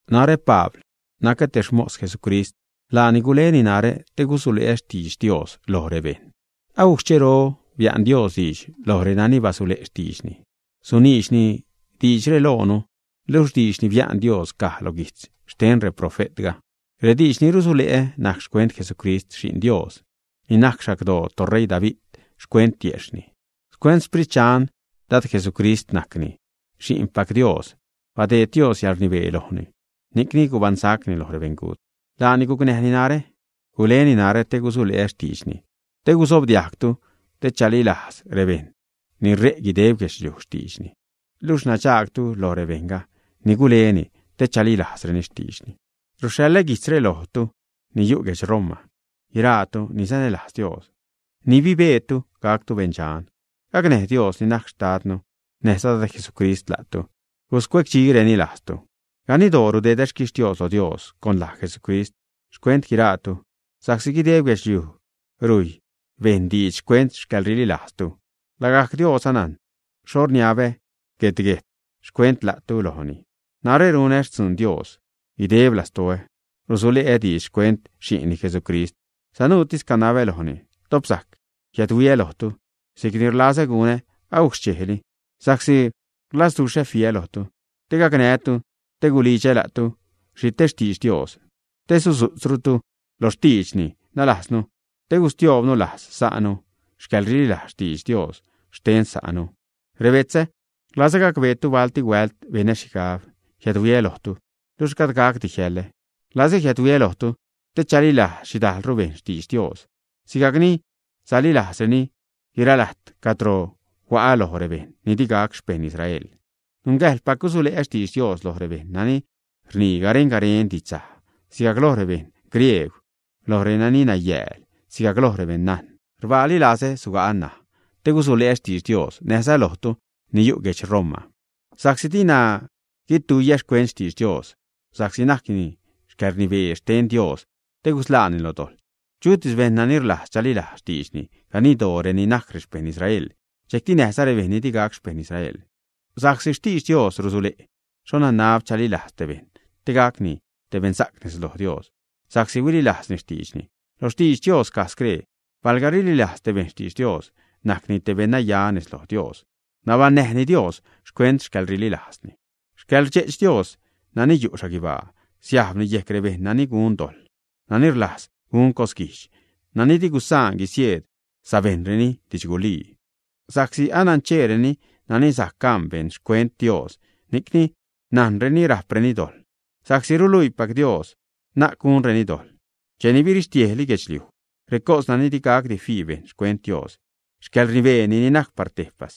Narä, Pabl, nacä te xmos Jesucrist, laani gule narä te gusule'ä xtidx Dios loj rebejṉ. Agujc xchero bia'n Dios diidx loj renani basule' xtiidxni, suniidxni diidxre loonu, luxh diidx ni bia'n Dios caj lo guijtz xten reprofe'tga. Rediidx ni rusule'ä najc xcuent Jesucrist, Xi'n Dios, ni najc xagdoo toṟeii David xcuent tiejxhni. Xcuent Xsprit Dxan Dad Jesucrist, najcni Xi'npac Dios. Badeed Dios yäḻrnibee lojni, ni'cni gubaṉsacni lo rebeṉgut. Laani gucnäjni narä, guleni narä te gusule'ä xtiidxni te guzobdiajgtu, te chalilajz rebejṉ ni rej guideb guedxliuj xtiidxni. Luxh nadxaagtu loj rebejṉ ni guleni te chalilajzreni xtiidxni. Ruxhaḻä guijtzre lojtu ni yu' guedx Roma, guiraatu ni sanälajz Dios ni bibeetu gactu beṉdxan. Gacnäj Dios ni najc Xtadnu näjza Dad Jesucrist la'tu, guscuecdxireni lajztu. Ganidtoo rudedä xquixtios loj Dios con laj Jesucrist xcuent guiraatu, sa'csi guideb guedxliuj rujy bejṉ diidx xcuent xcäḻrililajztu. Lagajc Dios anajn xho rniabä guet-guejt xcuent la'tu lojni. Narä runä xtzuun Dios guideb lastoä, rusule'ä diidx xcuent Xi'nni Jesucrist. Sanuutis canabä lojni, top sajc jiädhuiä lojtu si'cni rlazä gunä agujc xchejli. Sa'csi rlazduxhä fiä lojtu, te gacnää́tu, te gulidxä la'tu xhi te xtidx Dios te sudzu'tzrutu lo xtiidxni. Nalajznu, te gustioobnu lajz sa'nu xcäḻrililajz xtidx Dios xten sa'nu. Rebetzä rlazä gacbeetu balti huält benä xhigab jiädhuiä lojtu, luxh gajd gacdi jiäḻä. Rlazä jiädhuiä lojtu te chalilajz xhidajlru bejṉ xtidx Dios sigajcni salilajzreni guiralajt cadro hua'a loj rebejṉ ni di gac xpeṉ Israel. Nungäjḻpac gusule'ä xtidx Dios loj rebejṉ nani rnii garen-garen didxsaj, sigajc loj rebeṉ griegw, loj renani nayääl, sigajc loj rebeṉ najn. Rbaali lazä suga'a ṉaj, te gusule' xtidx Dios näjza lojtu ni yu' guedx Roma. Sa'csi dina guituiä xcuent xtidx Dios, sa'csi najcni yäḻrnibee xten Dios te gusḻaani lo dojḻ chutis bejṉ nani rlajz chalilajz xtiidxni, ganidtoo reni najc rexpejṉ Israel, dxejcti näjza rebejṉ ni di gac xpeṉ Israel. Sa'csi xtidx Dios rusule' xho nanab chalilajz te bejṉ te gacni te beṉsa'c nez lo Dios sa'csi huililajzni xtiidxni. Lo xtidx Dios caj scree: “Palga rililajz te bejṉ xtidx Dios, najcni te beṉnaya nez lo Dios, nabaṉnäjni Dios xcuent xcäḻrililajzni.” Xcälrdxe'ch Dios nani yu' xhaguibaa siajbni yejc rebejṉ nani gun dojḻ, nani rlajz gun cosguijdx, nani di gusaan guisieed sabejṉreni didxgulii. Sa'csi anancheereni nani sajc gan bejṉ xcuent Dios, ni'cni najnreni rajpreni dojḻ, sa'csi ruluipac Dios na'c gunreni dojḻ. Cheni birixtiejli guedxliuj, recos nani di gacdi fii bejṉ xcuent Dios, si'c xcäḻrnibeeni ni najc par tejpas,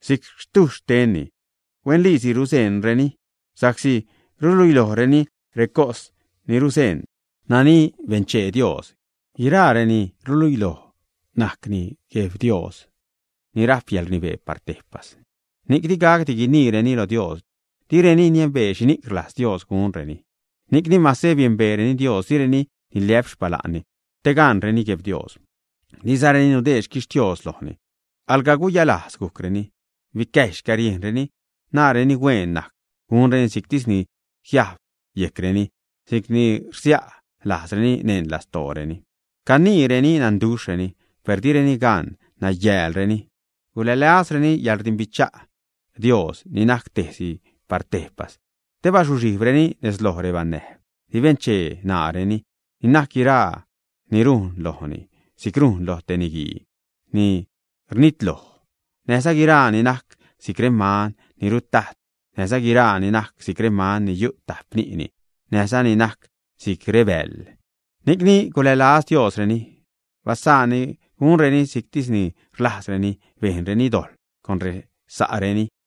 si'c xtujxh xtenni, huenliisi ruzeṉreni sa'csi ruluilojreni recos ni ruzeṉ nani benchee Dios. Guiraa reni'c ruluiloj najcni Gueb Dios ni rajp yäḻrnibee par tejpas, ni'c di gacdi guiniireni loj Dios direni niembee xhini'c rlajz Dios gunreni. Ni'cni, mase biembeereni Dios, direni niliä'p xpala'nni te gaṉreni Gueb Dios, dizareni nudeed xquixtios lojni. Alga guyalajz gujcreni, bicäjy xcäriejnreni, naareni hueen najc gunreni si'ctis ni jiajb yejcreni, si'cni rsia' lajzreni neṉ lastooreni. Caniireni nanduxhreni, per direni gan, nayäälreni. Gulälazreni xcäḻrdimbicha' Dios ni najc tejsi par tejpas, te bazuxhijbreni nez loj rebanäjb ni benchee ṉaareni, ni najc guiraa ni rujn lojni si'c rujn lo te niguii ni rnitloj, näjza guiraa ni najc si'c reman ni rutajt, näjza guiraa ni najc si'c reman ni yu' tajp ni'ni, näjza ni najc si'c rebäjl. Ni'cni gulälaz Diosreni, basaanni gunreni si'ctis ni rlajzreni. Bejnreni dojḻ con resa'reni.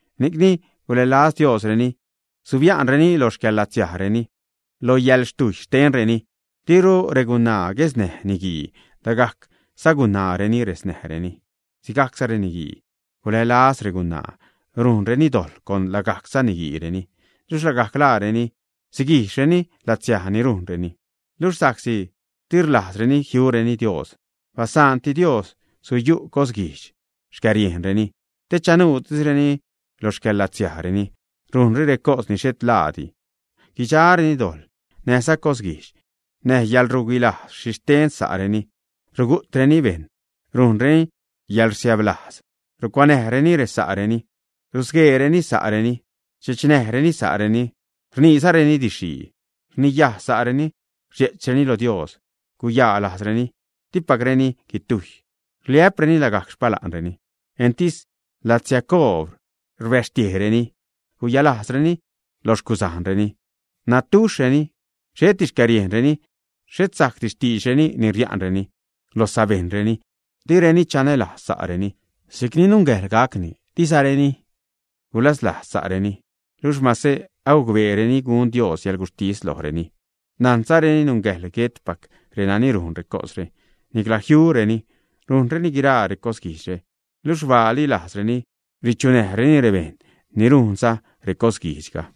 Ni'cni gulälaz Diosreni, subia'nreni lo xcäḻlatsiajreni, lo yäḻxtujy xtenreni. Diru regunaa guesnäj niguii, lagajc sagunaareni resnäjreni. Sigajcza reniguii gulälaz regunaa, rujnreni dojḻ con lagajc saniguiireni. Luxh lagajc laareni siguijxreni latsiaj ni rujnreni. Luxh sa'csi di rlajzreni jiureni Dios, basaanti Dios suyu' cosguijdxtis xcäriejnreni, te chanuutisreni lo xcäḻlatsiajreni, rujnreni recos ni xhet laadi. Guidxareni dojḻ, näjza cosguijdx, näj yäḻruguilajz xhixten sa'reni; rugu'treni bejṉ, rujnreni yäḻrsiäblajz, rucuanäjreni resa'reni, rusgueereni sa'reni, rdxechnäjreni sa'reni, rniizareni didxxhii. Rniyaj sa'reni, rdxe'chreni lo Dios, guyalajzreni, dipacreni guitujy, rliä'preni lagajc xpala'nreni, entis latsiacoob rbäxtiejreni, guyalajzreni lo xcuzajnreni, nadduxhreni, xheti xcäriejnreni, xhet sajcdi xtiidxreni ni ria'nreni lo sabejṉreni, direni chanälajz sa'reni si'cni nungäjḻ gacni, dizareni gulaslajz sa'reni. Luxh mase agucbeereni gun Dios yäḻguxhtis lojreni, najnzareni nungäjḻ guetpac renani rujn recosre, nicla jiureni, rujnreni guiraa recosguijdxre, luxh rbaali lajzreni richunäjreni rebejṉ ni rujnza recosguijdxga.